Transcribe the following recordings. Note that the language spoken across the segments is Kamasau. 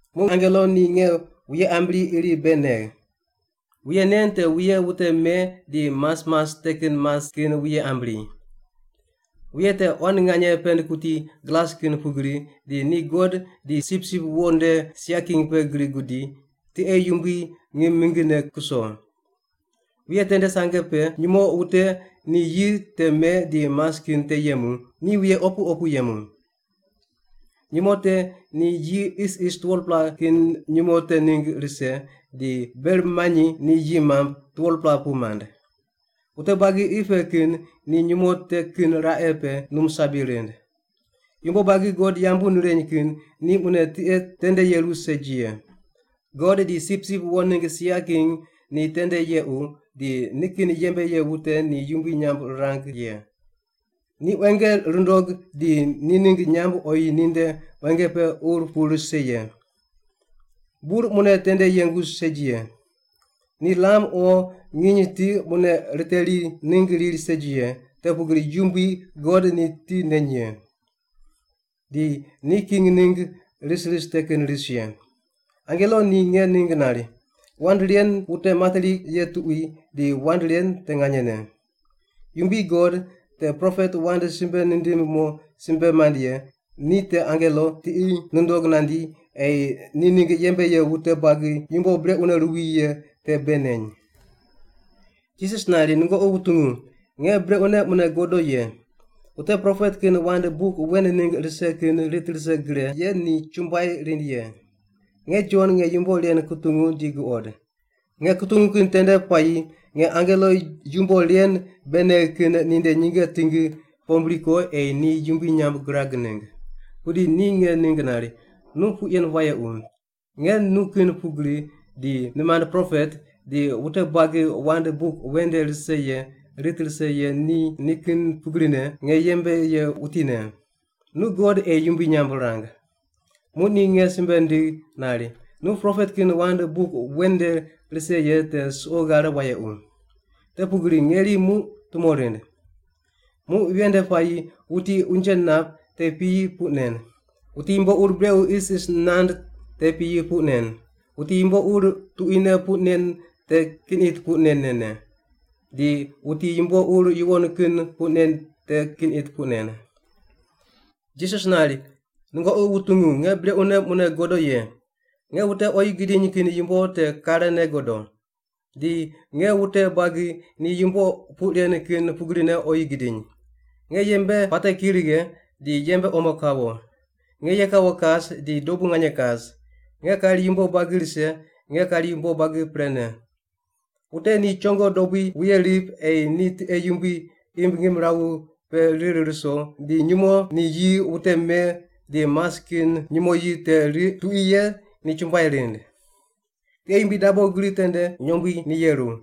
Muq angelo ni nge wuye ambri iri bei negh. Wuye nen te wuye wute me di mas mas te kin mas kin wuye ambri. Wuye te quan nganye pend kuti glas kin pugri, di ni God di Sipsip Wo nde sia king pe gri gudi, tiqe yumbui ngim mingine kuso. Wuye tende sange pe nyumo wute ni yi te me di mas kin te yemu, ni wuye opu opu yemu. Nyumo te ni yi isis 12-pela kin nyumo te ningg rise, di ber manyi ni yi mamb 12-pela pu mand. Wute buagi qi pe kin ni nyumo te kin raqe pe num sabi rind. Yumbo buagi God yambu nireny kin ni mune tiqe tende yeru segi ye. God di Sipsip Wo ningg sia king ni tende yequ, di ni kin yembe ye wute ni yumbui nyamb rirang ye. Ni quenge rundog di ni ningg nyamb oyi ninde quenge pe ur pu rise ye. Bur mune tende yengu segi ye. Ni lam o nginy ni ti mune riteri ningg riri segi ye, te pugri Yumbui God ni ti neny ye. Di ni king ningg ris ris te kin ris ye. Angelo ni nge ningg nari, “Wand ren wute materi ye tuqui, di wand ren te nganyene. Yumbui God, te propet wand simbe nindim mo simbe mand ye, ni te angelo tiqi nundog nandi ei ni ningg yembe ye wute buagi yumbo brequne ruwi ye te bei neny.” Jisas nari, “Nungoqi wutungu, nge brequne mune godo ye! Wute propet kin wand buk wen ningg rise kin rit rise gre ye ni chumbuai rind ye.” Nge Jon nge yumbo ren kutungu di guqod. Nge kutungu kin tende puayi nge angelo yumbo ren bei negh kin ninde nyinge tingi pombri ko ei ni yumbui nyamb girag ningg. Pudi ni nge ningg nari, “Nu puq yen wayequ! Nge nu kin pugri, di nimand propet, di wute buagi wand buk wen nde rise ye rit rise ye ni nikin pugrine, nge yembe ye wutine. Nu God ei yumbui nyamb rang!” Muq ni nge simbe nindigh nari, “Nu propet kin wand buk wen nde rise ye te suqo ghare wayequ. Te pugri ngeri muq tumo rind. Muq ven nde puayi wuti unje nap te piyi puq nen. Wuti yumbo ur brequ isis nand te piyi puq nen. Wuti yumbo ur tuquine puq nen te kin it puq nen nen ne, di wuti yumbo ur yuwon kin puq nen te kin it puq nen.” Jisas nari, “Nungoqi wutungu, nge brequne mune godo ye! Nge wute oyi gidiny kin yumbo te karene godo. Di nge wute buagi ni yumbo puq ren kin pugrine oyi gidiny. Nge yembe puate ki righe, di yembe omo kawo. Nge ye kawo kas di dobu nganye kas. Nge kari yumbo buagi rise; nge kari yumbo buagi prene. “Wute ni chongo dobui wuye rip ei ni tiqe yumbui imb ngimrawu pe rir ruso di nyumo ni yi wute me di mas kin nyumo yi te riq tuqui ye ni chumbuai rind. Tiqe yumbui dabo gri tende nyombui ni yeru.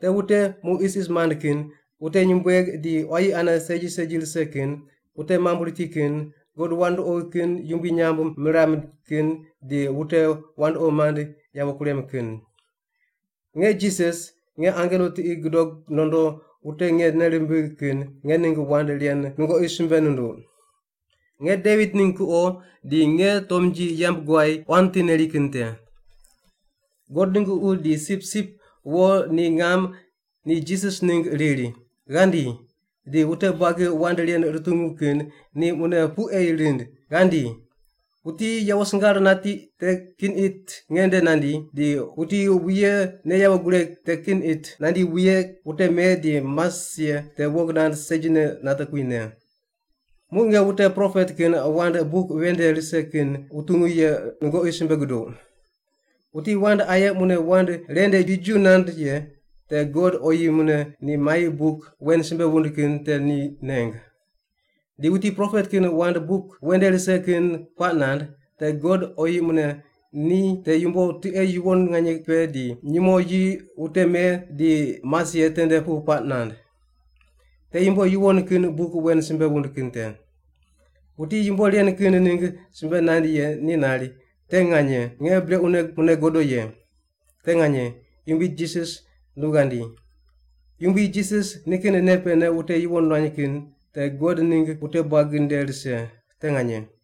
Te wute mu isis mand kin, wute nyumbueg di quayi ane segi segi rise kin, wute mamb riti kin, god wandoqi kin yumbui nyamb miram kin di wute wandoqi mand yawo kurem kin. “Nge Jisas, nge angelo tiqi gudog nondo wute nge nei rimbigh kin nge ningg wand ren nungoqi simbe nunduq. Nge Devit ningg kuqo, di nge tomnji yamb guay quan ti neri kin te.” God ningg Ququ di Sipsip Wo ni ngam ni Jisas ningg riri, “Ghandi!” Di wute buagi wand ren rutungu kin ni mune puq ei rind, “Ghandi!” Wuti yawo singar nati te kin it nge nde nandi, di wuti wuye ne yawo gureg te kin it nandi wuye wute me di mas ye te wong nand segine nate kuwi, ne. Muq nge wute propet kin wand buk wen nde rise kin wutungu ye nungoqi simbe guduq: Wuti wand aye mune wand ren nde jiju nand ye te God oyi mune ni mai buk wen simbe wund kin te ni neng. Di wuti propet kin wand buk wen nde rise kin puaq nand, te God oyi mune ni te yumbo tiqe yuwon nganye pe di nyumo yi wute me di mas ye tende pu puaq nand. Te yumbo yuwon kin buk wen simbe wund kin te. Wuti yumbo ren kin ningg simbe nand ye ni nari, “Te nganye, nge brequne mune godo ye!” Te nganye, Yumbui Jisas nu ghandi. Yumbui Jisas ni kin nei pene wute yuwon nuany kin te God ningg wute buagi nde rise. Te nganye.